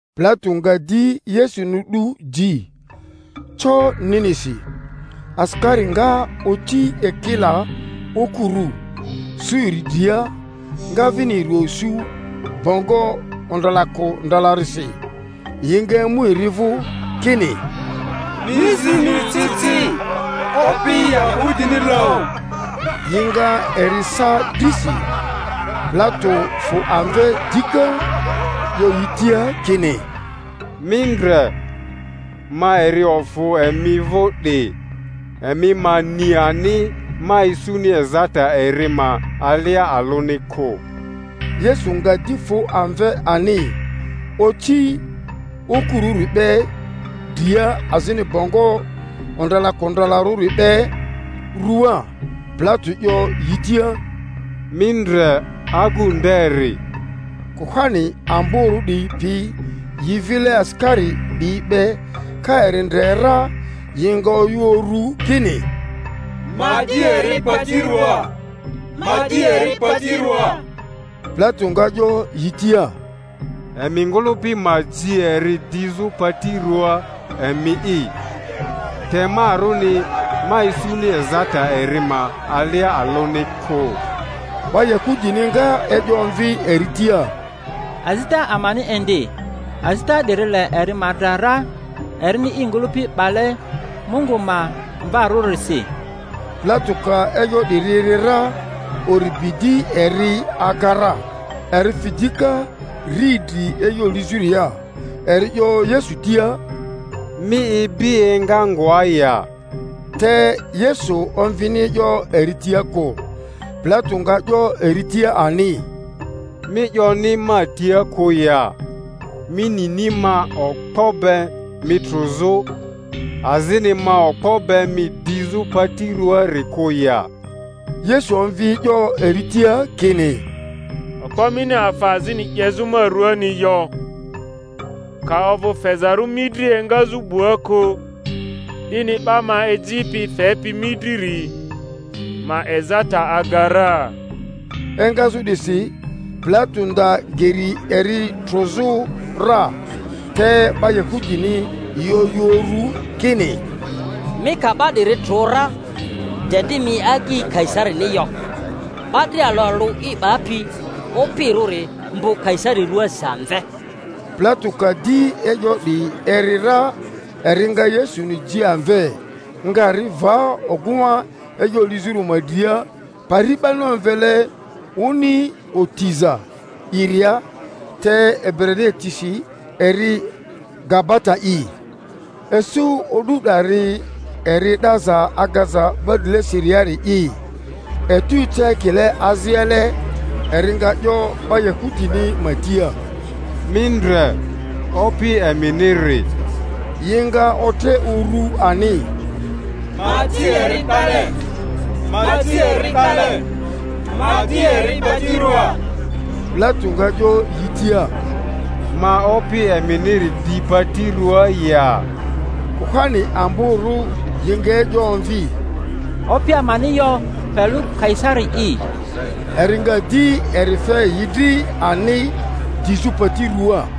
Pilato nga di Yesuni 'du ji, co ninisi. Asikari nga oci ekila okurᴜ, sᴜ eri dria, nga vini eri esu bongo ondralakondralarisi; yi nga emu eri vᴜ, kini, Mi zi mi ci ci, Opi Yahudini loᴜ! Yi nga eri sa drisi. Pilato fᴜ amve dika, 'yo yi tia kini, Mi ndre, ma eri ofᴜ emi vᴜ 'di, emi ma ni ani ma isuni ezata eri ma alia alᴜni kᴜ. Yesu nga di fᴜ amve ani, oci okurᴜri be dria azini bongo ondralakondralarᴜri be ruaa. Pilato 'yo yi tia, Mi ndre, agᴜ nderi! Kuhani amborᴜ 'diyi pi yi vile asikari 'diyi be ka eri ndre ra, yi nga oyᴜ uru kini, Ma di eri pati ruaa, ma di eri pati ruaa! Pilato nga 'yo yi tia, Emi ngᴜlᴜpi ma ji eri dizᴜ pati ruaa emi'i, te marᴜni ma isuni ezata eri ma alia alᴜni kᴜ. 'Ba Yahudini nga e'yo omvi eri tia, Azita amani indi, azita 'diri le eri ma dra ra, erini i ngᴜlᴜpi 'bale Mungu ma Mvarᴜrisi. Pilato ka e'yo 'diri eri ra, uri bi di eri aga ra; eri fi dika riidri e'yo lizᴜria, eri 'yo Yesu tia, Mi ibi enga ngoa ya? Te Yesu omvini e'yo eri tia kᴜ. Pilato nga 'yo eri tia ani, Mi 'yoni ma tia kᴜ ya? Mi nini ma okpo be mi trᴜzᴜ, azini ma okpo be mi dizᴜ pati ruaari kᴜ ya? Yesu omvi e'yo eri tia kini, Okpo mini afa azini 'yezᴜ ma ruaani yo, ka ovᴜ fezarᴜ mi dri engazᴜ 'bua kᴜ; 'dini 'ba ma ejipi fepi mi driri ma ezata aga ra. Engazᴜ 'disi Pilato nda geri eri trᴜzᴜ ra, te 'ba Yahudini yi oyᴜ uru kini, Mi ka 'ba 'diri trᴜ ra, de di mi agyi Kaisarini yo; 'ba dria alᴜ alᴜ i 'bapi opirᴜri mbᴜ Kaisari ruaasi amve. Pilato ka di e'yo 'diyi eri ra, eri nga Yesuni ji amve, nga ri va ogᴜŋa e'yo lizᴜri ma dria, pari 'bani omvele Oni Otiza'iria, te Ebrania tisi eri Gabata'i. Isu o'du 'dari eri Edeza agaza 'ba drilesiriari'i; etu eca ekile aziale. Eri nga 'yo 'ba Yahudini ma tia, Mi ndre, Opi eminiri! Yi nga otre urᴜ ani, Ma ji eri 'dale, ma ji eri 'dale, ma di eri pati ruaa! Pilato nga 'yo yi tia, Ma Opi eminiri di pati ruaa ya? Kuhani amborᴜ yi nga e'yo omvi, Opi amani yo pe lᴜ Kaisari'i. Eri nga di eri fe yi dri ani dizᴜ pati ruaa.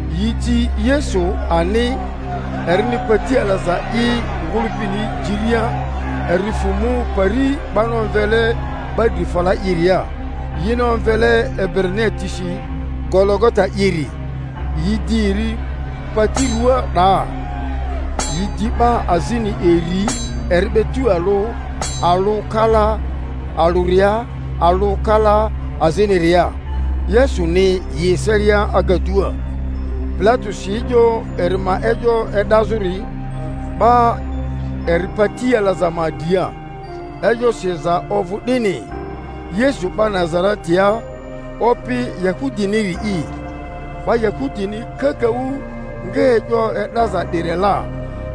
Yi ji Yesu ani, erini pati alaza i ngᴜlᴜpini jiria, eri fᴜ mu pari 'bani omvele 'Ba dri fala i'ria, yini omvele Ebrania tisi Gologota'iri. Yi di eri pati rᴜaa 'daa, yi di 'ba azini iri eri be tualᴜ, alᴜ kala alᴜria, alᴜ kala aziniria, Yesuni yi eselia agadua. Pilato si e'yo eri ma e'yo e'dazᴜri, 'ba eri pati alaza ma dria; e'yo siza ovᴜ 'dini, YESU 'BA NAZA-RETIA, OPI YAHUDINIRI'I. 'Ba Yahudini kakaᴜ nga e'yo e'daza 'diri la,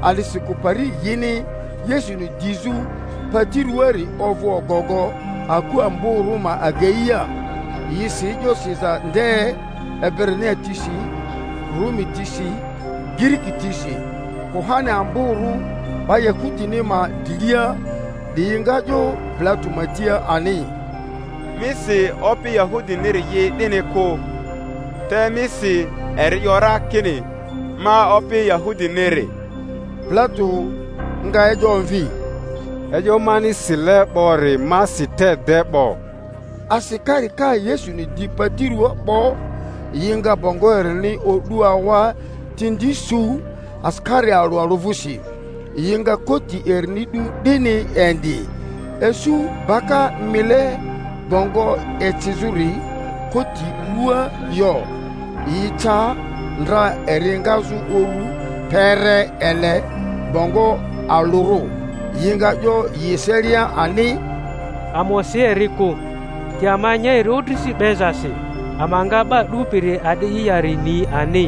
a'disikᴜ pari yini Yesuni dizᴜ pati ruaari ovᴜ ogogo aku amborᴜ ma ageia; yi si e'yo siza nde Ebrania tisi, Rumi tisi, Giriki tisi. Kuhani amborᴜ 'ba Yahudini ma drilia 'diyi nga 'yo Pilato ma tia ani, Mi si, Opi Yahudiniri'i 'dini kᴜ, te mi si, Eri 'yo ra kini, Ma Opi Yahudiniri. Pilato nga e'yo omvi, E'yo mani sile 'bori ma si te de 'bo. Asikari ka Yesuni di pati ruaa 'bo, yi nga bongo erini o'du awa tindi su asikari alᴜ alᴜ vᴜsi; yi nga koti erini 'du 'dini indi. Isu baka mile bongo ecizᴜri koti ruaa yo, yi ca ndra eri engazᴜ uru kpere ele bongo alᴜrᴜ; yi nga 'yo yi eselia ani, Ama osi eri kᴜ, te ama nya eri odrisi 'bezasi, ama nga 'ba 'dupiri a'di'i yari ni ani.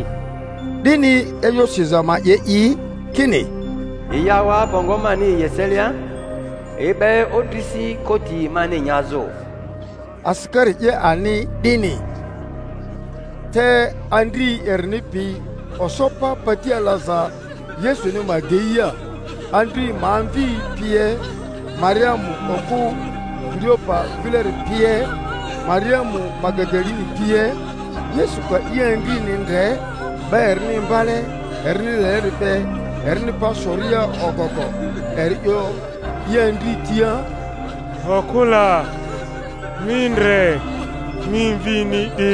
'Dini e'yo siza ma 'ye i, kini, Yi awa bongo mani yi eselia, yi 'be odrisi koti mani nyazᴜ. Asikari 'ye ani 'dini. Te andri erini pi oso pa pati alaza Yesuni ma ageia, andri ma amvi pie, Mariamu okᴜ Kileopa vileri pie, Mariamu Magadaleni pie. Yesu ka i andrini ndre, 'ba erini imbale erini leleri be erini pa soria ogogo, eri 'yo i andri tia, Okᴜ la, mi ndre, mi mvini 'di!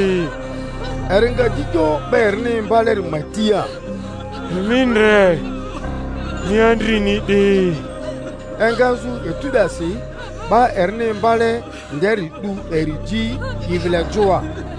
Eri nga di 'yo 'ba erini imbaleri ma tia, Mi ndre, mi andrini 'di! Engazᴜ etu 'dasi 'ba erini imbale nderi 'du eri ji i vile joa.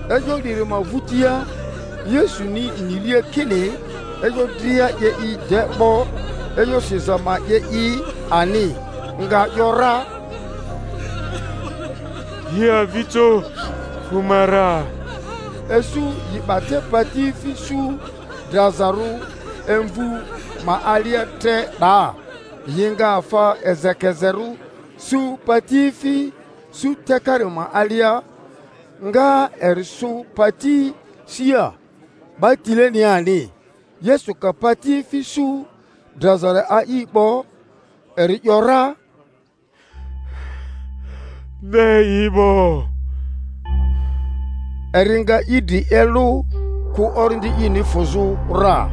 E'yo 'diri ma vᴜtia, Yesuni niria kini e'yo dria 'ye yi de 'bo, e'yo siza ma 'ye i ani, nga ‘yora, Yi avijo fᴜ ma ra. Isu yi 'ba te patiefi su drazarᴜ imvᴜ ma alia tre 'daa; yi nga afa ezekezerᴜ sᴜ patiefi su takari ma alia, nga eri sᴜ pati sia, 'ba tilenia ani. Yesu ka patiefi su drazari a'i 'bo, eri ‘yora, De i 'bo; eri nga i dri elᴜ, kᴜ orindi ini fᴜzᴜ ra.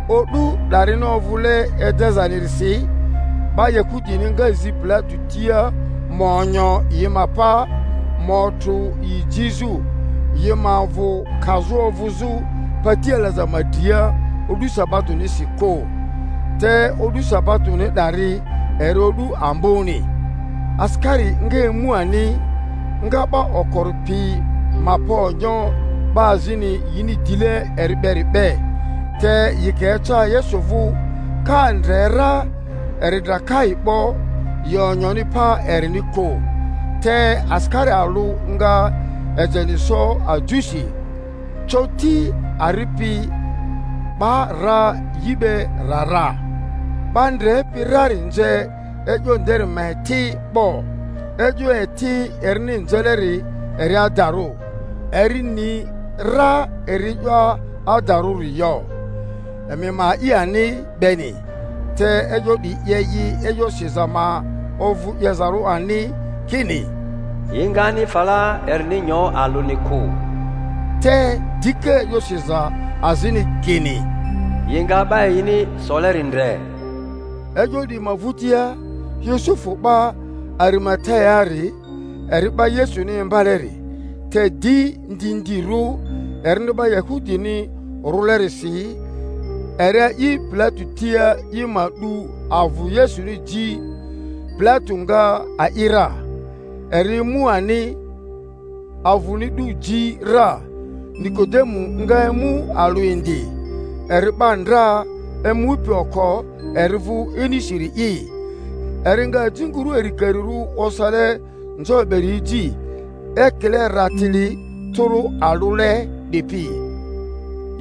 O'du 'darini ovᴜle Edezanirisi, 'ba Yahudini nga zi Pilato tia ma onyo yi ma pa, ma otrᴜ yi jizᴜ, yi ma avᴜ kazᴜ ovᴜzᴜ pati alaza ma dria o'du sabatonisi kᴜ (te o'du sabatoni 'dari eri o'du amboni). Asikari nga emu ani, nga 'ba okori pi ma pa onyo 'ba azini yini dile eri beri be; te yi ka eca Yesu vᴜ, ka ndre ra eri dra kai 'bo, yi onyoni pa erini kᴜ. Te asikari alᴜ nga ejeni so ajusi, coti ari pi 'ba ra yi be ra ra. 'Ba ndrepi rari nze e'yo nderi ma eti 'bo—e'yo eti erini nzeleri eri adarᴜ, eri ni ra eri e'yo adarᴜri 'yo—emi ma a'i ani beni. Te e'yo 'diyi 'ye yi e'yo siza ma ovᴜ 'yezarᴜ ani, kini, Yi ngani fala erini nyo alᴜni kᴜ. Te dika e'yo siza azini kini, Yi nga 'ba yini soleri ndre. E'yo 'diyi ma vᴜtia, Yusufu 'ba Arimateaari, eri 'ba Yesuni imbaleri, te di ndindirᴜ erini 'ba Yahudini rᴜlerisi, eri a'i Pilato tia i ma 'du avᴜ Yesuni ji; Pilato nga a'i ra. Eri emu ani, avᴜni 'du ji ra. Nikodemu nga emu alᴜ indi, eri 'ba ndra emupi oko eri vᴜ inisiri'i, eri nga ajinguru arikarirᴜ osale nzo beri eji, ekile ratili tᴜrᴜ alᴜle 'dipi.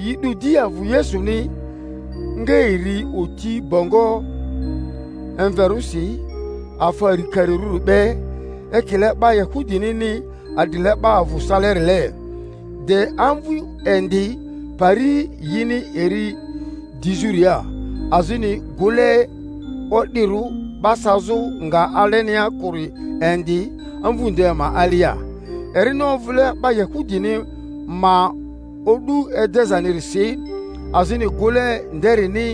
Yi 'du di avᴜ Yesuni, nga eri oti bongo emverᴜsi afa arikarirᴜri be, ekile 'ba Yahudinini adrile 'ba avᴜ salerile. De amvu indi pari yini eri dizᴜria, azini gᴜle o'dirᴜ 'ba sazᴜ nga alenia kᴜri indi amvu nde ma alia. Erini ovᴜle 'ba Yahudini ma o'du Edezanirisi, azini gᴜle nderini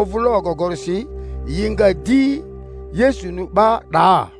ovᴜle ogogorisi, yi nga di Yesuni 'ba 'daa.